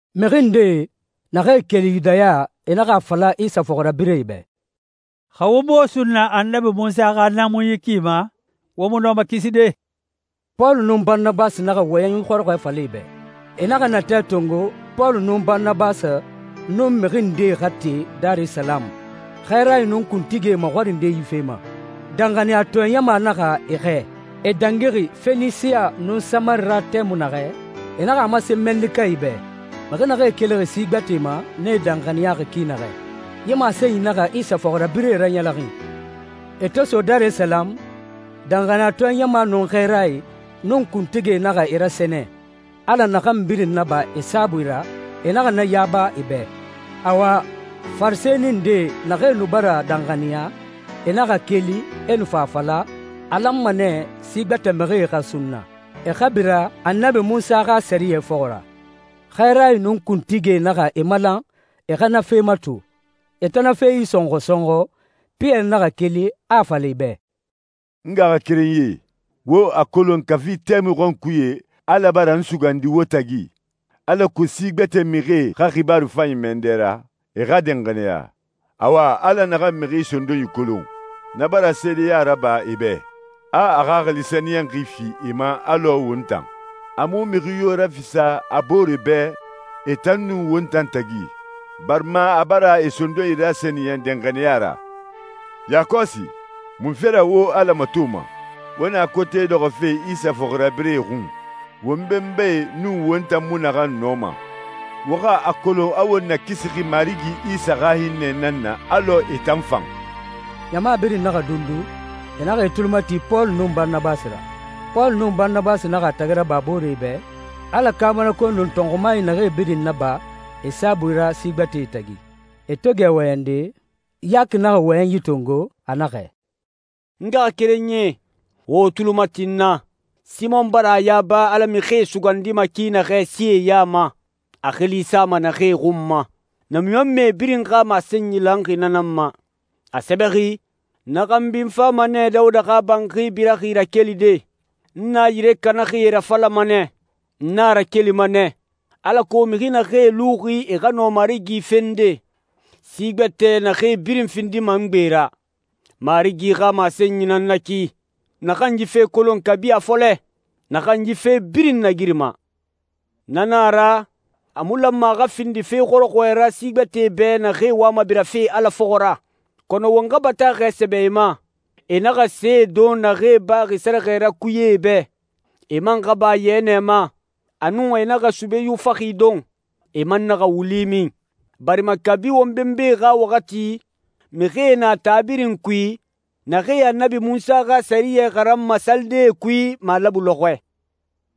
Mixi ndee naxee keli Yudaya, e naxa a fala Isa fɔxirabirɛe bɛ, «Xa wo mu wo sunna Annabi Munsa xa naamunyi ki ma, wo mu nɔma kiside.» Pɔlu nun Baranabasi naxa wɔyɛnyi xɔrɔxɔɛ fala e bɛ. E naxa natɛ tongo Pɔlu nun Baranabasi nun mixi ndee xa te Darisalamu xɛɛrae nun kuntigie maxɔrinde yi fe ma. Danxaniyatɔɛ ɲama naxa e xɛɛ. E dangixi Fenisiya nun Samari ra tɛmui naxɛ, e naxa a masen mɛnnikae bɛ, mixi naxee kelixi si gbɛtɛe ma, nee danxaniyaxi ki naxɛ. Yi masenyi naxa Isa fɔxirabirɛe raɲɛlɛxin. E to so Darisalamu, danxaniyatɔɛ ɲama nun xɛɛrae, nun kuntigie naxa e rasɛnɛ. Ala naxan birin naba e saabui ra, e naxa na yaba e bɛ. Awa, Farisɛni nde naxee nu bara danxaniya, e naxa keli, e nu fa a fala, a lanma nɛ si gbɛtɛ mixie xa sunna, e xa bira Annabi Munsa xa sɛriyɛ fɔxɔ ra. Xɛɛrae nun kuntigie naxa e malan e xa na fe mato. E to na fe isɔnxɔ sɔnxɔ, Piyɛri naxa keli, a a fala e bɛ, «N ngaxakerenyie, wo a kolon kafi tɛmui xɔnkuye Ala bara n sugandi wo tagi, alako si gbɛtɛ mixie xa xibaaru fanyi mɛ n dɛ ra, e xa danxaniya. Awa, Ala naxan mixi sondonyi kolon, na bara seedeya raba e bɛ, a a Xaxili Sɛniyɛnxi fi e ma alɔ won tan. A mu mixi yo rafisa a boore bɛ e tan nun won tan tagi, barima a bara e sondonyi rasɛniyɛn danxaniya ra. Yakɔsi, munfe ra wo Ala matoma? Wo na kote dɔxɔfe Isa fɔxirabirɛe xun, won benbae nun won tan mu naxan nɔma. Wo xa a kolon a won nakisixi Marigi Isa xa hinnɛ nan na alɔ e tan fan.» Ɲama birin naxa dundu, e naxa e tuli mati Pɔlu nun Baranabasi ra. Pɔlu nun Baranabasi naxa a tagi raba booree bɛ Ala kaabanakoe nun tɔnxumae naxee birin naba e saabui ra si gbɛtɛe tagi. E to gɛ wɔyɛnde, Yaki naxa wɔyɛnyi tongo, a naxɛ, «N ngaxakerenyie, wo wo tuli mati n na. Simɔn bara a yaba Ala mixie sugandima ki naxɛ sie ya ma, a xili sama naxee xun ma. Namiɲɔnmɛe birin xa masenyi lanxi na nan ma. A sɛbɛxi, ‹Na xanbi n fama nɛ Dawuda xa banxi biraxi rakelide. N na yire kanaxie rafalama nɛ, n na rakelima nɛ, alako mixi naxee luxi e xa nɔ Marigi fende, si gbɛtɛ naxee birin findima n gbe ra. Marigi xa masenyi nan na ki, naxan yi fe kolon kabi a fɔlɛ, naxan yi fe birin nagirima.›» «Na na a ra, a mu lanma a xa findi fe xɔrɔxɔɛ ra si gbɛtɛe bɛ naxee wama birafe Ala fɔxɔ ra. Kɔnɔ won xa bataaxɛ sɛbɛ e ma, e naxa see don naxee baxi sɛrɛxɛ ra kuyee bɛ. E man xa ba yɛnɛ ma, a nun e naxa sube yufaxi don, e man naxa wuli min. Barima kabi won benbae xa waxati, mixie na taa birin kui, naxee Annabi Munsa xa sɛriyɛ xaranma salidee kui malabu lɔxɔɛ.»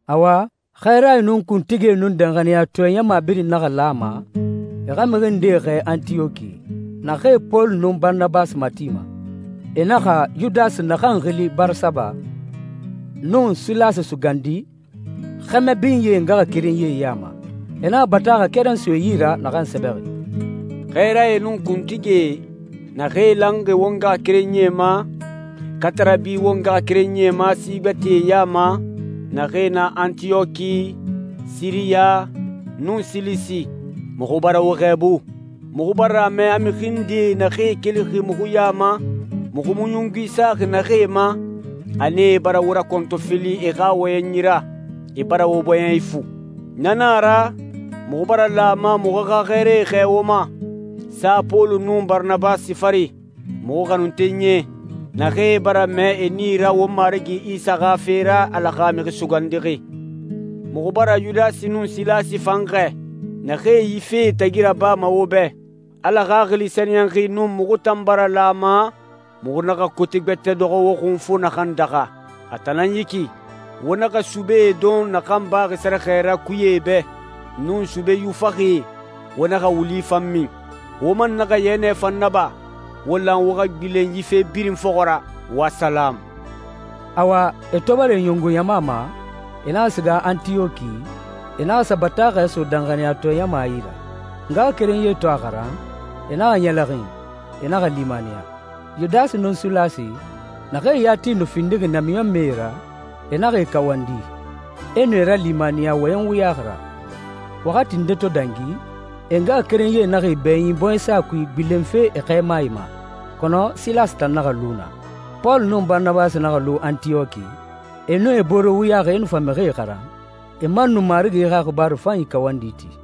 Awa, xɛɛrae nun kuntigie nun danxaniyatɔɛ ɲama birin naxa lan a ma e xa mixi ndee xɛɛ Antiyɔki, naxee Pɔlu nun Baranabasi matima. E naxa Yudasi naxan xili Barasaba, nun Silasi sugandi, xɛmɛ binyee ngaxakerenyie ya ma. E naxa bataaxɛ keren so e yi ra naxan sɛbɛxi, «Xɛɛrae nun kuntigie, naxee lanxi wo ngaxakerenyie ma, katarabi won ngaxakerenyie ma si gbɛtɛe ya ma, naxee na Antiyɔki, Siriya, nun Silisi, muxu bara wo xɛɛbu. Muxu bara a mɛ a mixi ndee naxee kelixi muxu ya ma, muxu mu ɲungui saxi naxee ma, a nee bara wo rakɔntɔfili e xa wɔyɛnyi ra. E bara wo bɔɲɛ ifu.» «Na na a ra, muxu bara lan a ma muxu xa xɛɛrae xɛɛ wo ma, sa Pɔlu nun Baranabasi fari, muxu xanuntenyie, naxee bara mɛɛ e nii ra won Marigi Isa xa fe ra, Ala xa Mixi Sugandixi. Muxu bara Yudasi nun Silasi fan xɛɛ, naxee yi fee tagi rabama wo bɛ. Ala Xaxili Sɛniyɛnxi nun muxu tan bara lan a ma muxu naxa kote gbɛtɛ dɔxɔ wo xun fo naxan daxa. A tan nan yi ki: Wo naxa sube don naxan baxi sɛrɛxɛ ra kuyee bɛ, nun sube yufaxie, wo naxa wuli fan min. Wo man naxa yɛnɛ fan naba. Wo lan wo xa gbilen yi fe birin fɔxɔ ra. Wo salamu.» Awa, e to bara e ɲungu ɲama ma, e naxa siga Antiyɔki, e naxa sa bataaxɛ so danxaniyatɔɛ ɲama yi ra. Ngaxakerenyie to a xaran, e naxa ɲɛlɛxin, e naxa limaniya. Yudasi nun Silasi, naxee yati nu findixi namiɲɔnmɛe ra, e naxa e kawandi, e nu e ralimaniya wɔyɛn wuyaxi ra. Waxati nde to dangi, e ngaxakerenyie naxa e bɛɲin bɔɲɛsa kui gbilenfe e xɛɛmae ma. Kɔnɔ Silasi tan naxa lu naa. Pɔlu nun Baranabasi naxa lu Antiyɔki, e nun e boore wuyaxi e nu fa mixie xaran, e man nu Marigi xa xibaaru fanyi kawandi ti.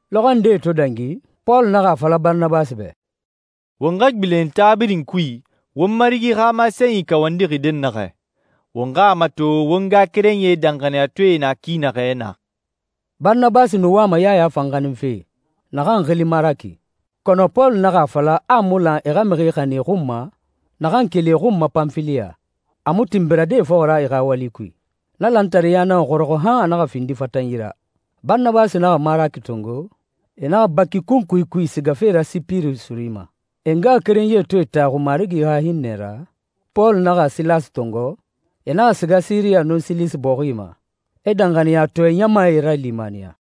Lɔxɔɛ ndee to dangi, Pɔlu naxa a fala Baranabasi bɛ, «Won xa gbilen taa birin kui won Marigi xa masenyi kawandixi dɛnnaxɛ, won xa a mato won ngaxakerenyie danxaniyatɔɛe na ki naxɛ naa.» Baranabasi nu wama Yaya fan xaninfe, naxan xili Maraki. Kɔnɔ Pɔlu naxa a fala a mu lan e xa mixi xanin e xun ma naxan keli e xun ma Panfiliya, a mu tin birade e fɔxɔ ra e xa wali kui. Na lantareya naxa xɔrɔxɔ han a naxa findi fatanyi ra. Baranabasi naxa Maraki tongo, e naxa baki kunkui kui sigafe ra Sipiri suri ma. E ngaxakerenyie to e taxu Marigi xa hinnɛ ra, Pɔlu naxa Silasi tongo, e naxa siga Siriya nun Silisi bɔxie ma, e danxaniyatɔɛ ɲamae ralimaniya.